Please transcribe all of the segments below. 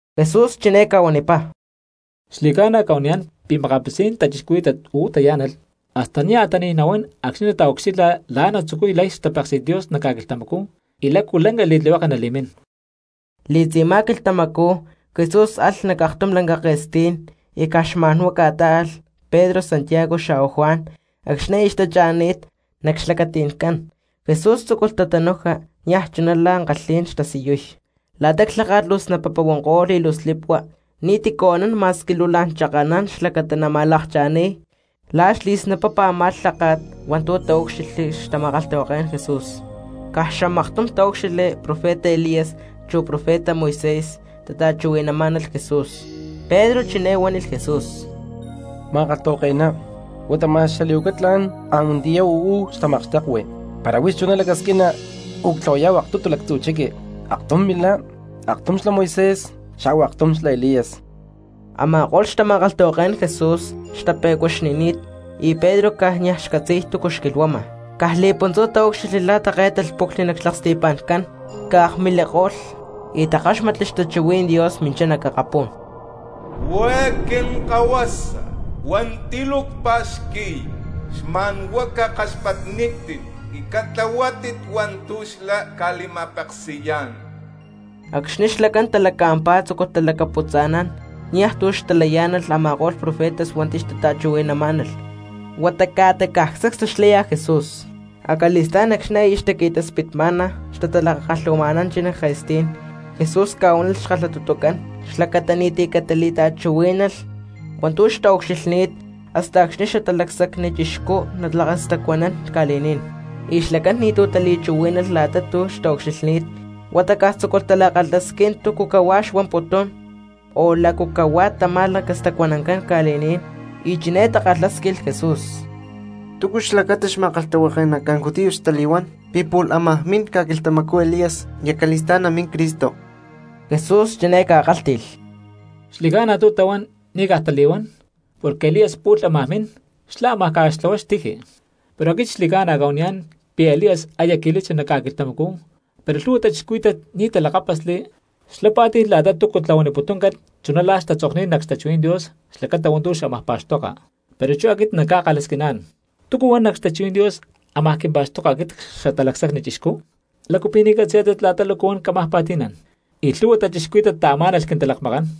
Jesús chiné ca̠huanipá: —Xli̠ca̠na cca̠huaniyá̠n pi̠ makapitzí̠n cristianos uú tayá̠nalh hasta nia̠ tani̠y nahuán acxni̠ nataucxilha la̠ natzucuy lay xtapéksi̠t Dios nac ca̠quilhtamacú y lácu lanca li̠tlihueke nali̠mín. Li̠tzi̠má quilhtamacú Jesús alh nac aktum lanca ke̠stí̠n y caj xma̠nhuá ca̠tá̠alh Pedro, Santiago xa̠hua Juan; acxni̠ aya xtacha̠ni̠t, nac xlacati̠ncán, Jesús tzúculh tatanuja niaj chuná la̠ ankalhí̠n xtasiyuy. La̠ta clháka̠t luu snapapa huanko̠lh y luu slipua, ni̠ti̠cu anán cristiano ma̠squi luu la̠n chakanán xlacata nama̠lakcha̠níy la̠ xli̠snapapa a̠má clháka̠t hua̠ntu̠ taúcxilhli xtama̠kalhtahuaké̠n Jesús. Caj xamaktum taúcxilhli profeta Elías, chu profeta Moisés xtata̠chuhui̠namá̠nalh Jesús. Pedro chiné huánilh Jesús: —Ma̠kalhtahuake̠ná, huata ma̠x xali̠huaca tla̠n antiyá uú xtamakxtekui, para huix chuná lacasquina u̠ctlahuayá̠hu aktutu lactzu chiqui, aktum milá, aktum xlá Moisés xa̠hua aktum xlá Elías. Ama̠ko̠lh xtama̠kalhtahuaké̠n Jesús xtape̠cuaxni̠ni̠t, y Pedro caj niaj xcatzi̠y túcu xquilhuama. Caj li̠puntzú taúcxilhli la̠ také̠talh puclhni nac xlaksti̠pa̠ncán, ca̠akmiliko̠lh, y takáxmatli xtachuhuí̠n Dios minchá nac akapú̠n: —Huá eé Quinkahuasa hua̠nti̠ luu cpa̠xqui̠y, xma̠nhuá cakaxpatnítit y catlahuátit hua̠ntu̠ xlá ca̠li̠ma̠peksi̠yá̠n. Acxni̠ xlacán talaca̠mpá, tzúculh talacaputza̠nán, niaj tu̠ xtalayá̠nalh a̠ma̠ko̠lh profetas hua̠nti̠ xtata̠chuhui̠namá̠nalh, huata ca̠ta caj sacstu xlaya Jesús. Acali̠stá̠n acxni̠ aya xtaqui̠taspitma̠na xtatalakakalhu̠ma̠nanchi nac ke̠stí̠n Jesús ca̠huánilh xkalhatutucán xlacata ni̠ti̠ catali̠ta̠chuhuí̠nalh hua̠ntu̠ xtaucxilhni̠t hasta acxni̠ xlá Xatalacsacni Chixcú nalacastacuanán ca̠li̠ní̠n. Y xlacán ni̠tu̠ tali̠chuhuí̠nalh la̠ta tu̠ xtaucxilhni̠t, huata caj tzúculh tala̠kalhasquín túcu cahuá xuamputún, o lácu cahuá tamá lacastacuanancán ca̠li̠ní̠n. Y chiné takalhásquilh Jesús: —¿Túcu xlacata xma̠kalhtahuake̠nacán judíos tali̠huán pi̠ pu̠lh ámaj min ca̠quilhtamacú Elías y acali̠stá̠n namín Cristo? Jesús chiné ca̠kálhti̠lh: —Xli̠ca̠na tu̠ tahuán, ni̠ caj tali̠huán, porque Elías pu̠lh ámaj min, xlá ámaj ca̠xtlahuay xtiji. Pero aquit xli̠cána cca̠huaniyá̠n pi̠ Elías aya qui̠lachi nac ca̠quilhtamacú pero lhu̠hua cristianos ni̠ talakápasli, xlá pá̠ti̠lh la̠ta túcu tlahuaniputúncalh chuná la̠ xtatzokni̠t nac xtachuhuí̠n Dios xlacata hua̠ntu̠ xámaj pa̠xtoka. Pero chú aquit na̠ cca̠kalhasquiná̠n: ¿Túcu huan nac xtachuhuí̠n Dios ámaj quimpa̠xtoka aquit Xatalacsacni Chixcú? ¿Lácu pi̠ ni̠ catzi̠yá̠tit la̠ta lácu huan cámaj pa̠ti̠nán y lhu̠hua cristianos taamá̠nalh quintalakmakán?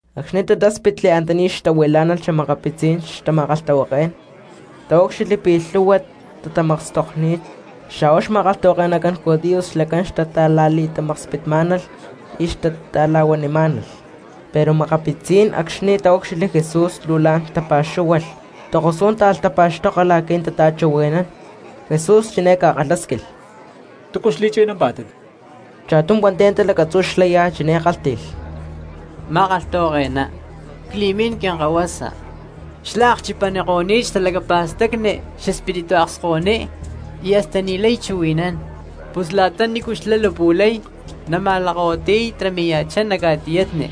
Acxni̠ tatáspitli antaní xtahuilá̠nalh xa̠makapitzí̠n xtama̠kalhtahuaké̠n taúcxilhli pi̠ lhúhua cristianos xtatamakstokni̠t xa̠hua xma̠kalhtahuake̠nacán judíos xlacán xtata̠la̠li̠tamakspitmá̠nalh y xtata̠la̠huanimá̠nalh. Pero makapitzí̠n cristianos acxni̠ taúcxilhli Jesús luu la̠n tapa̠xúhualh, tokosú̠n táalh tapa̠xtoka la̠qui̠ natata̠chuhui̠nán. Jesús chiné ca̠kalhásquilh: —¿Túcu xli̠chuhui̠nampá̠tit? Cha̠tum hua̠nti̠ antá lacatzú xlaya chiné kálhti̠lh: —Ma̠kalhtahuake̠ná, cli̠mín quinkahuasa xlá akchipaniko̠ni̠t xtalacapa̠stacni xespíritu akskahuiní y hasta niajlay chuhui̠nán. Pus la̠ta nícu xlá lapu̠lay nama̠lakahuitiy y tarami̠ya̠chá nac ca̠tiyatni;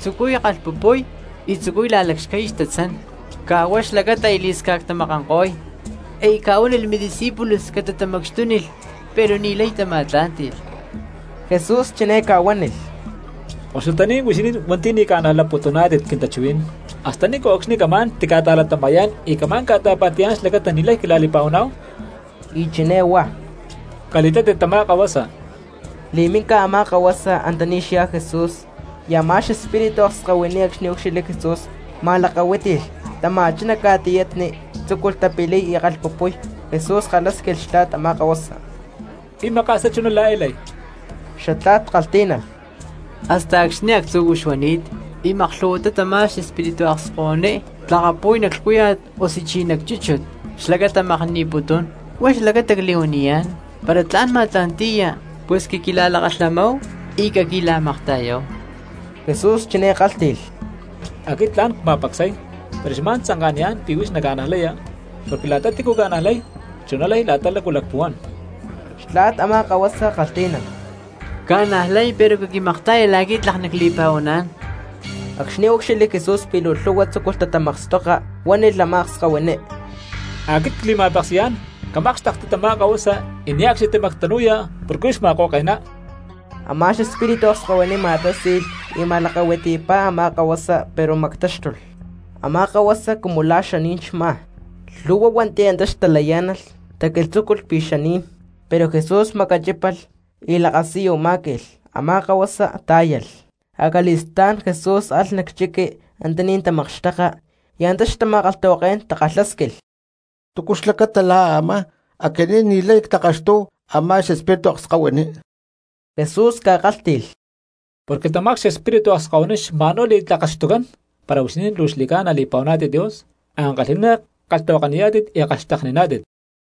tzucuy kalhpupuy y tzucuy la̠lacxcay xtatzán, caj huá xlacata aya li̠sca̠ctamakanko̠y. Aya ca̠huánilh midiscípulos catatamacxtúnilh, pero ni̠lay tama̠tlá̠nti̠lh. Jesús chiné ca̠huánilh: —Koxutaní̠n huixinín cristianos hua̠nti̠ ni̠ ca̠najlaputuná̠tit quintachuhuí̠n. ¿Hasta ni̠nco̠cxni camá̠n tica̠ta̠latama̠yá̠n y camá̠n ca̠ta̠pa̠ti̠yá̠n xlacata ni̠lay quila̠li̠pa̠huaná̠hu? Y chiné huá: —Cali̠tátit tamá kahuasa. Li̠minica a̠má kahuasa antaní xyá Jesús. Y a̠má xespíritu akskahuiní acxni̠ úcxilhli Jesús ma̠lakahuítilh, tama̠chá nac ca̠tiyatni, tzúculh tapiliy y kalhpupuy. Jesús kalhásquilh xtla̠t a̠má kahuasa: —¿Pi̠ maka̠sá chuná la̠ eé lay? Xatla̠t kalhtí̠nalh: —Hasta acxni̠ actzu̠cú xuani̠t. Y maklhu̠huatá tamá xespíritu akskahuiní tlakapu̠y nac lhcúya̠t osuchi nac chúchut xlacata makni̠putún. Huá xlacata cli̠huaniyá̠n, para tla̠n ma̠tla̠nti̠ya pus caquila̠lakalhamáhu y caquila̠makta̠yáhu. Jesús chiné kálhti̠lh: —Aquit tla̠n cma̠pacsay, pero xma̠n tzanka̠niyá̠n pi̠ huix naca̠najlaya, porque la̠ta tícu ca̠najlay chuná lay la̠ta lácu lacpuhuán. Xtla̠t a̠má kahuasa kalhtí̠nalh: —Cca̠najlay pero caquimakta̠ya la̠qui̠ tlak nacli̠pa̠huaná̠n. Acxni̠ úcxilhli Jesús pi̠ luu lhu̠hua tzúculh tatamakstoka cristianos, huánilh a̠má akskahuiní: —Aquit cli̠ma̠peksi̠yá̠n, camákxtekti tamá kahuasa y niaj ne̠cxni camactanu porque huix ma̠ko̠ke̠ná. Amá xespíritu akskahuiní ma̠tási̠lh y ma̠lakahuitipá a̠má kahuasa pero mactáxtulh, a̠má kahuasa cumu la̠ xaní̠n xmá; lhu̠hua cristianos hua̠nti̠ antá xtalayá̠nalh taquilhtzúculh pi̠ xaní̠n. Pero Jesús macachípalh y lakasiyu má̠qui̠lh, a̠má kahuasa tá̠yalh. Acali̠stá̠n Jesús alh nac chiqui antaní xtatamakxteka y antá xtama̠kalhtahuaké̠n takalhásquilh: —¿Túcu xlacata la̠ a̠má aquinín ni̠lay ctlakaxtúhu a̠má xespíritu akskahuiní? Jesús ca̠kálhti̠lh: —Porque tamá xespíritu akskahuiní xma̠nhuá li̠tlakaxtucán para huixinín luu xli̠ca̠na li̠pa̠huaná̠tit Dios, ankalhi̠ná kalhtahuakaniyá̠tit y kalhxtekniná̠tit.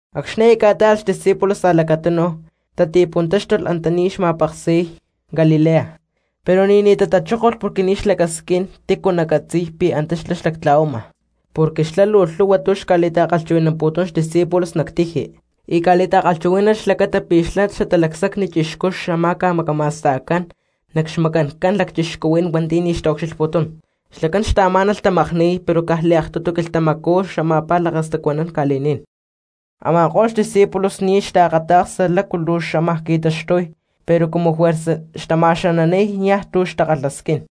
Acxni̠ aya ca̠tá̠alh xdiscípulos a̠lacatunu tati̠puntáxtulh antaní xma̠peksi̠y Galilea, pero ni̠ní tatachókolh porque ni̠ xlacasquín tícu nacatzi̠y para antá xlá xlactla̠huama. Porque xlá lhu̠hua tu̠ xca̠li̠ta̠chuhui̠namputún xdiscípulos nac tiji. Y ca̠li̠ta̠kalhchuhuí̠nalh xlacata pi̠ xlá Xatalacsacni Chixcú xama̠ca macama̠sta̠cán nac xmacanca̠n lacchixcuhuí̠n hua̠nti̠ ni̠ xtaucxilhputún, xlacán xtaamá̠nalh tamakníy pero caj xliaktutu quilhtamacú xlá xama̠paj lacastacuanán ca̠li̠ní̠n. Ama̠ko̠lh xdiscípulos ni̠ xtaakata̠ksa lácu luu xama qui̠taxtuy pero cumu juerza xtama̠xananíy niaj tu̠ xtakalhasquín.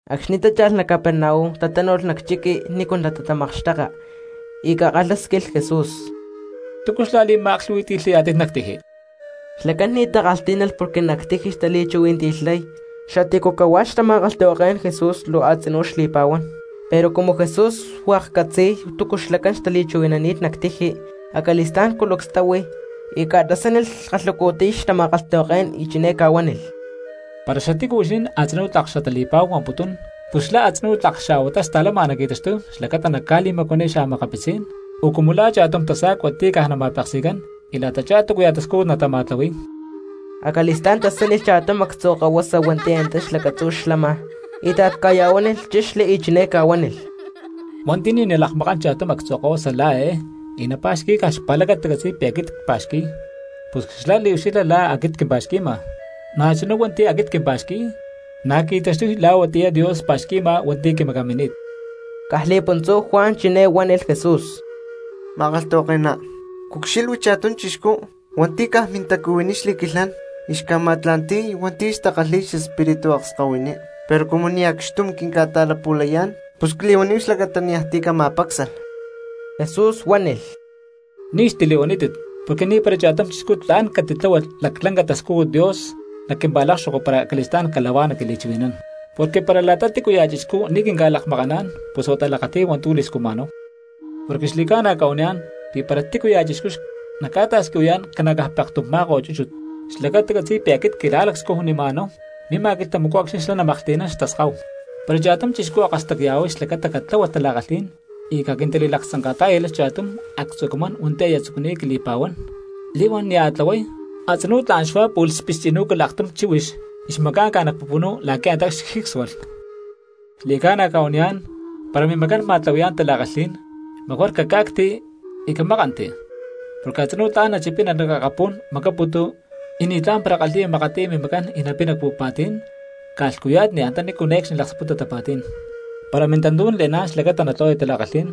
Acxni̠ tácha̠lh nac Capernaum tatánu̠lh nac chiqui nícu natamakxteka, y ca̠kalhásquilh Jesús: —¿Túcu xla̠li̠ma̠aklhu̠hui̠ti̠lhayá̠tit nac tiji? Xlacán ni̠ takalhtí̠nalh porque nac tiji xtali̠chuhui̠nanti̠lhay xatícu cahuá xtama̠kalhtahuaké̠n Jesús luu a̠tzinú xli̠pa̠huán. Pero cumu Jesús hua̠k xcatzi̠y túcu xlacán xtali̠chuhui̠nani̠t nac tiji, acali̠stá̠n culucs táhui y ca̠tasánilh kalhacu̠tiy xtama̠kalhtahuaké̠n, chiné ca̠huánilh: —Para xatícu huixinín a̠tzinú tlak xatali̠pa̠hu huamputún pus xlá a̠tzinú tlak xaa̠huatá sta̠lama naqui̠taxtuy xlacata naca̠li̠macuaniy xa̠makapitzí̠n o cumu la̠ cha̠tum tasa̠cua ti̠ caj nama̠peksi̠cán y la̠tachá túcuya̠ tascújut natama̠tlahui̠y. Acali̠stá̠n tasánilh cha̠tum actzu̠ kahuasa hua̠nti̠ antá lacatzú xlama, íta̠t ca̠ya̠huánilh, chexli, y chiné ca̠huánilh: —Hua̠nti̠ ni̠ nalakmakán cha̠tum actzu̠ kahuasa la̠ eé y napa̠xqui̠y caj xpa̠lacata catzi̠y pi̠ aquit cpa̠xqui̠y pus cliucxilha la̠ aquit quimpa̠xqui̠ma, na̠chuná hua̠nti̠ aquit quimpa̠xqui̠y na̠ qui̠taxtuy la̠ huatiyá Dios pa̠xqui̠ma hua̠nti̠ quimacamini̠t. Caj li̠puntzú Juan chiné huánilh Jesús: —Ma̠kalhtahuake̠ná, cucxilhui cha̠tum chixcú hua̠nti̠ caj mintacuhuiní xli̠quilhán y xca̠ma̠tla̠nti̠y hua̠nti̠ xtakalhi̠y xespíritu akskahuiní, pero cumu ni̠ acxtum quinca̠ta̠lapu̠layá̠n pus cli̠huaníhu xlacata niaj ti̠ cama̠pácsalh. Jesús huánilh: —Ni̠ xtili̠huanítit porque ni̠para cha̠tum chixcú tla̠n catitláhualh laclanca xtascújut Dios nac quimpa̠lákxoko para acali̠stá̠n cala̠huá naquili̠chuhui̠nán. Porque para la̠ta tícuya̠ cristiano ni̠ quinca̠lakmakaná̠n pus huata lakati̠y hua̠ntu̠ li̠scujma̠náhu. Porque xli̠ca̠na cca̠huaniyá̠n pi̠ para tícuya̠ cristiano naca̠ta̠squihuayá̠n ca̠na̠caj pekstum má̠ko̠t chúchut xlacata catzi̠y pi̠ aquit quila̠lacscujnima̠náhu, mima quilhtamacú acxni̠ xlá namaklhtínán xtaskáhu. ’Para cha̠tum cristiano akastacya̠huay xlacata catláhualh tala̠kalhí̠n y caquintali̠laktzanka̠tá̠yalh cha̠tum actzú̠ camán hua̠nti̠ aya tzucuni̠t quili̠pa̠huán, li̠huán nia̠ tlahuay, a̠tzinú tla̠n xuá pu̠lh xpixchi̠nú̠calh aktum chíhuix y xmaca̠nca nac pupunú la̠quí̠ antá xjícsualh. Xli̠ca̠na cca̠huaniyá̠n para mimacán ma̠tlahui̠yá̠n tala̠kalhí̠n mejor caca̠cti y camákanti, porque a̠tzinú tla̠n nachipina nac akapú̠n makaputu y ni̠tlá̠n para kalhi̠ya makatiy mimacán y napina cpu̠pa̠tí̠n, ca̠lhcuya̠tni antanícu ne̠cxní laksputa tapa̠tí̠n. Para mintantú̠n le̠ná̠n xlacata natlahuaya tala̠kalhí̠n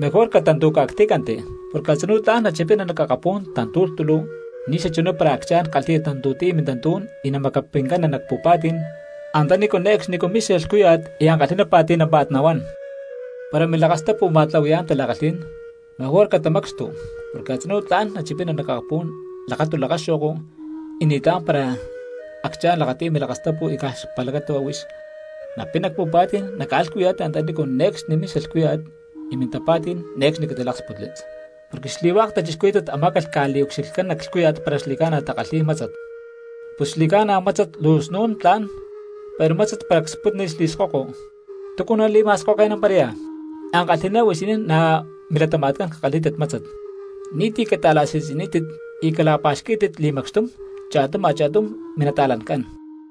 mejor catantu̠ca̠ctí̠canti porque a̠tzinú tla̠n nachipina nac akapú̠n tantu̠lhtúlu ni̠xachuná para acchá̠n kalhi̠ya tantu̠tiy mintantú̠n y namacapincana nac pu̠pa̠tí̠n antanícu ne̠cxní mixa lhcúya̠t y ankalhi̠ná pa̠ti̠námpa̠t nahuán. Para milakastapu ma̠tlahui̠yá̠n tala̠kalhí̠n, mejor catamacxtu porque a̠tzinú tla̠n nachipina nac akapú̠n lakatu lakaxo̠ko, y ni̠tlá̠n para acchá̠n lakati̠y milakastapu y caj xpa̠lacata huá huix napina cpu̠pa̠tí̠n nac ca̠lhcuya̠tni antanícu ne̠cxni mixa lhcúya̠t y mintapa̠tí̠n ne̠cxni catiláksputli. ’Porque xli̠hua̠k cristianos amá̠calh ca̠liucxilhcán nac lhcúya̠t para xli̠ca̠na takalhi̠y mátzat. Pus xli̠ca̠na, mátzat luu snún tla̠n, pero mátzat para cspútnilh xli̠skoko, ¿túcu nali̠ma̠skoke̠namparaya? Ankalhi̠ná huixinín nac milatama̠tcán cakalhí̠tit mátzat, ni̠ti̠ cata̠la̠si̠tzi̠nítit y cala̠pa̠xquí̠tit li̠macxtum cha̠tum a̠cha̠tum minta̠cristianoscán.